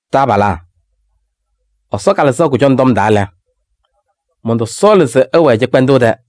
Taabalaa, Ɛsɔ Kalɩzaɣ kʋjɔŋ tɔm taa lɛ, mɔntɔsɔɔlɩ se ɩwɛɛ cɩkpɛndʋʋ tɛɛ.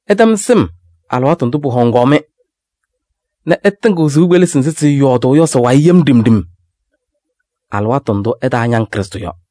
Ɩtɛm sɩm ɛzɩma mbʋ pʋhɔŋaɣ-mɩ nɛ ɩtɩŋɩɣ sɩʋ kpelisi nzɩ sɩɩyɔɔdʋʋ yɔ sɩ-wayɩ yem ɖimɖim alɩwaatʋ ndʋ ɩtaañaŋ Krɩstʋ yɔ.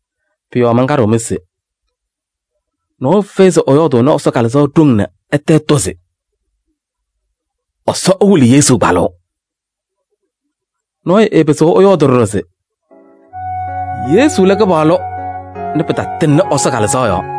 Pʋ-yɔɔ mankaɖɩɣ-mɩ se: nɔɔyʋ fɛyɩ se ɛyɔɔdʋʋnɩ Ɛsɔ Kalɩzaɣ ɖoŋ nɛ ɛtɛ ɛtɔ se: “Ɛsɔ ɛwɩlɩ Yesu kpalʋʋ.” Nɔɔyʋ ɛɛpɩzɩɣ ɛyɔɔdɩ ɖɔɖɔ se: “Yesu lɛ Kɩpaɣlʋ” nɛ pɩtatɩŋnɩ Ɛsɔ Kalɩzaɣ yɔɔ.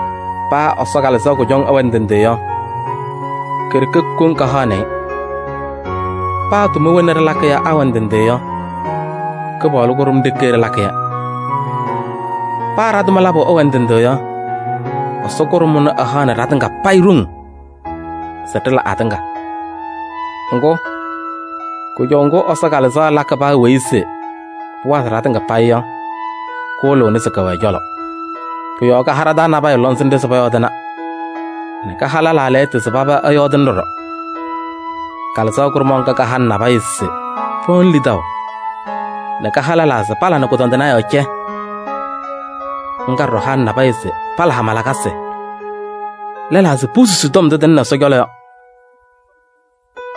Paa Ɛsɔ Kalɩzaɣ kʋjɔŋ ɩwɛ ndɩ ndɩ yɔ, ke-ɖeke koŋ kahaɣnɩ-ɩ. Paa tʋma wena ɖɩlakɩ yɔ awɛ ndɩ ndɩ yɔ, Kɩpaɣlʋ kʋɖʋm ɖeke ɖɩlakɩ-yɛ. Paa ɖa-tʋma labʋ ɛwɛ ndɩ ndɩ yɔ, Ɛsɔ kʋɖʋm ɛnʋ ɛhaɣnɩ ɖatɩŋa payɩ ɖoŋ se ɖɩla atɩŋa. Ŋgʋ, kʋjɔʋ ŋgʋ Ɛsɔ Kalɩzaɣ lakɩ paa weyi se pʋwazɩ ɖatɩŋa payɩ yɔ, kɩwɩlɩɣna se kɛwɛ ɛ-cɔlɔ. Pʋ-yɔɔ kaha ɖa-taa nabɛyɛ lɔŋsɩnɖɛ se pɔyɔɔdɩna, nɛ kaha lɛlaa lɛɣtʋ se paba ɛyɔɔdɩna ɖɔɖɔ. Kalɩzaɣ kʋɖʋmaɣ ŋga kahanɩ nabɛyɛ se pɛwɛnɩ lidaʋ nɛ kaha lɛlaa se pala nɛ kʋdɔndɩnaa yɔɔ cɛ. Ŋga ɖɔɖɔ hanɩ nabɛyɛ se pala hama lakasɩ, lɛlaa se posusi tɔm ndʋ tɩlɩnɩ Ɛsɔ cɔlɔ yɔ,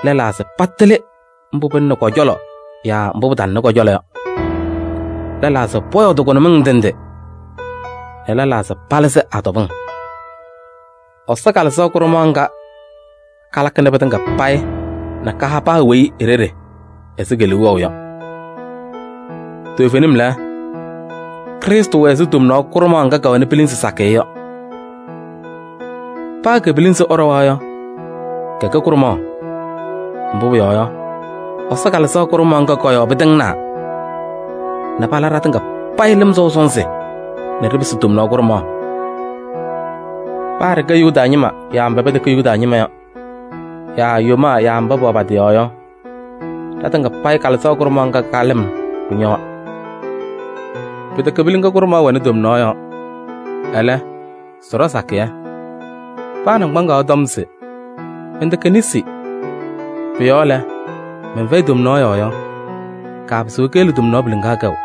lɛlaa se patɩlɩ mbʋ pɩlɩnɩ Kɔ-cɔlɔ yaa mbʋ pɩtalɩnɩ kɔ-cɔlɔ yɔ, lɛlaa se pɔyɔɔdɩ kʋnʋmɩŋ ndɩ ndɩ nɛ lɛlaa se palɩzɩ a-tɔbɩŋ. Ɛsɔ Kalɩzaɣ kʋɖʋmaɣ ŋga kalakɩnɩ pɩtɩŋa payɩ nɛ kaha paa weyi e-ɖeɖe ɛzɩ ke-liu wɛʋ yɔ. Toovenim lɛ, Krɩstʋ wɛ ɛzɩ tomnaɣ kʋɖʋmaɣ ŋga kɛwɛnɩ pilinzi sakɩyɛ yɔ. Paa ke-pilinzi ɛɖɔwa yɔ, kɛkɛ kʋɖʋmaɣ. Mbʋ pʋyɔɔ yɔ, Ɛsɔ Kalɩzaɣ kʋɖʋmaɣ ŋga kɔ-yɔɔ pɩtɩŋnaa nɛ pala ɖatɩŋa payɩ lɩm sɔʋ sɔnzɩ nɛ ɖɩpɩsɩ tomnaɣ kʋɖʋmaɣ. Paa ɖɩkɛ Yuda ñɩma yaa mba pɛtɛkɛ Yuda ñɩma yɔ, yaa yomaa yaa mba pɛwɛ pa-tɩ yɔɔ yɔ, ɖatɩŋa payɩ Kalɩzaɣ kʋɖʋmaɣ ŋga ka-lɩm ɖɩñɔwa. Pɩtɛkɛ piliŋa kʋɖʋmaɣ wɛnɩ tomnaɣ yɔɔ, ɛlɛ, sɩɖɔ sakɩyɛ. Paa naŋgbaŋaɣ ɛtɔm se: “Mɛntɛkɛ nesi, pʋ-yɔɔ lɛ, mɛnfɛyɩ tomnaɣ yɔɔ” yɔ, kaapɩzɩɣ keyele tomnaɣ piliŋa kɛʋ.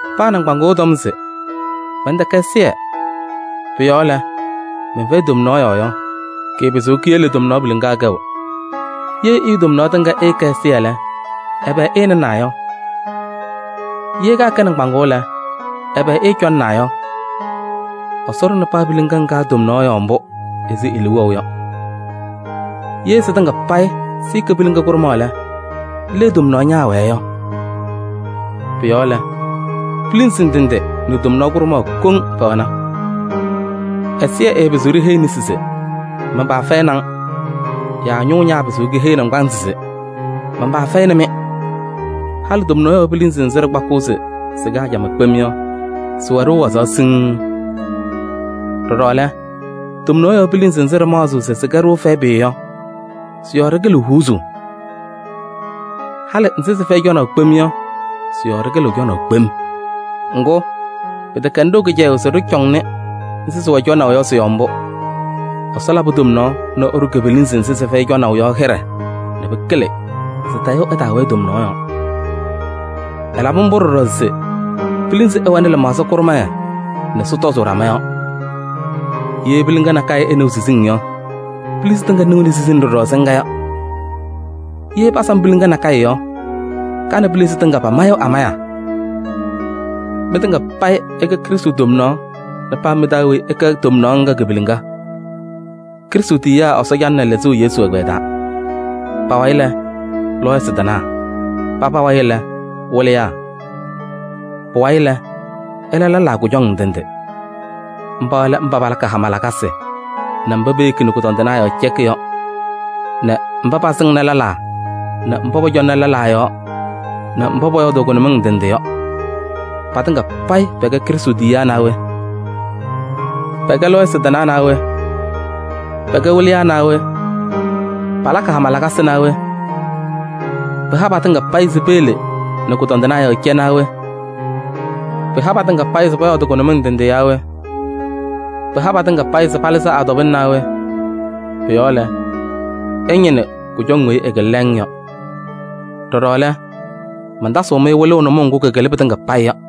Paa nɩŋgbaŋʋʋ ɛtɔm se: “Mɛntɛkɛ ɛzɩyɛ, pʋ-yɔɔ lɛ, mɛnfɛyɩ tomnaɣ yɔɔ” yɔ, kɩɩpɩzɩɣ kiyele tomnaɣ piliŋa kɛʋ. Ye ɛyʋ tomnaɣ tɩŋa ɛɛkɛ ɛzɩyɛ lɛ, ɛbɛ ɛɛnɩnaa yɔ? Ye kaakɛ nɩŋgbaŋʋʋ lɛ, ɛbɛ ɛɛsɔŋnaa yɔ? Ɛsɔ ɖʋnɩ paa piliŋa ŋga tomnaɣ yɔɔ mbʋ ɛzɩ e-liu wɛʋ yɔ. Ye sɩtɩŋa payɩ sɩɩkɛ piliŋa kʋɖʋmaɣ lɛ, le tomnaɣ ñaawɛɛ yɔ? Pʋ-yɔɔ lɛ, pilinzi ndɩ ndɩ nɛ tomnaɣ kʋɖʋmaɣ koŋ pɛwɛna. Ɛsɩyɛ ɛɛpɩzɩɣ ɖiheyi nesi se: “Man-paa fɛyɩnɩ-ŋ.” Yaa ñʋʋ ñaapɩzɩɣ kiheyi naŋgbanzɩ se: “Man-paa fɛyɩnɩ-mɩ.” Halɩ tomnaɣ yɔɔ pilinzi nzɩ ɖɩkpakɩɣ se sɩkɛ ajamaa kpem yɔ, sɩwɛ-ɖʋ wazaɣ siŋŋ. Ɖɔɖɔ lɛ, tomnaɣ yɔɔ pilinzi nzɩ ɖɩmaɣzɩɣ se sɩkɛ-ɖʋ fɛyɛ pʋyʋ yɔ, sɩ-yɔɔ ɖɩkɩlɩɣ huuzuu. Halɩ nzɩ sɩfɛyɩ cɔnaʋ kpem yɔ, sɩ-yɔɔ ɖɩkɩlɩɣ cɔnaʋ kpem. Ŋgʋ, pɩtɛkɛnɩ-ɖʋ kɩcɛyʋʋ se ɖɩcɔŋnɩ nzɩ sɩwɛ cɔnaʋ yɔ sɩ-yɔɔ mbʋ. Ɛsɔ labɩ tomnaɣ nɛ ɛɖʋ ke-pilinzi nzɩ sɩfɛyɩ cɔnaʋ yɔ hɩɖɛ nɛ pɩkɩlɩ se tayʋʋ ɛtaawɛɛ tomnaɣ yɔɔ. Ɛlabɩ mbʋ ɖɔɖɔ se pilinzi ɛwɛnɩ lɩmaɣza kʋɖʋmɛɛ nɛ sɩtɔzʋʋ ɖama yɔɔ. Ye piliŋa nakɛyɛ ɛnɩɣ siziŋ yɔ, pilinzi tɩŋa nɩɣ siziŋ ɖɔɖɔ ɛzɩ ŋga yɔ. Ye pasam piliŋa nakɛyɛ yɔ, ka nɛ pilinzi tɩŋa pamayɩɣ amaya. Mɩtɩŋa payɩ ɩkɛ Krɩstʋ tomnaɣ nɛ paa mɩ-taa weyi ɛkɛ tomnaɣ ŋga ke-piliŋa. Krɩstʋ tiyiyaa Ɛsɔ calɩnɩ lɩzʋʋ Yesu ɛgbɛyɛ taa. Pa-wayɩ lɛ, lɔɔyɩsɩ tɩnaa, paba wayɩ lɛ, wɩlɩyaa. Pʋwayɩ lɛ, ɛla lɛlaa kʋjɔŋ ndɩ ndɩ: mba lɛ mba palakɩ hama lakasɩ nɛ mba peyeki se kʋdɔndɩnaa yɔɔ ɛcɛ yɔ nɛ mba pasɩŋnɩ lɛlaa nɛ mba pɔcɔŋnɩ lɛlaa yɔɔ yɔ nɛ mba pɔyɔɔdʋʋ kʋnʋmɩŋ ndɩ ndɩ yɔ. Patɩŋa payɩ pɛkɛ Krɩstʋ tiyiyaa naa we? Pɛkɛ lɔɔyɩsɩ tɩnaa naa we? Pɛkɛ wɩlɩyaa naa we? Palakɩ hama lakasɩ naa we? Pɩha patɩŋa payɩ se peyele kʋdɔndɩnaa yɔɔ cɛ naa we? Pɩha patɩŋa payɩ se pɔyɔɔdɩ kʋnʋmɩŋ ndɩ ndɩ yaa we? Pɩha patɩŋa payɩ se palɩzɩ a-tɔbɩŋ naa we? Pʋ-yɔɔ lɛ, ɩñɩnɩ kʋjɔŋ weyi ɩkɩlɩ lɛɛŋ yɔ. Ɖɔɖɔ lɛ, mantasɩɣ-mɩ wɩlʋʋ nʋmɔʋ ŋgʋ kɩkɩlɩ pɩtɩŋa payɩ yɔ.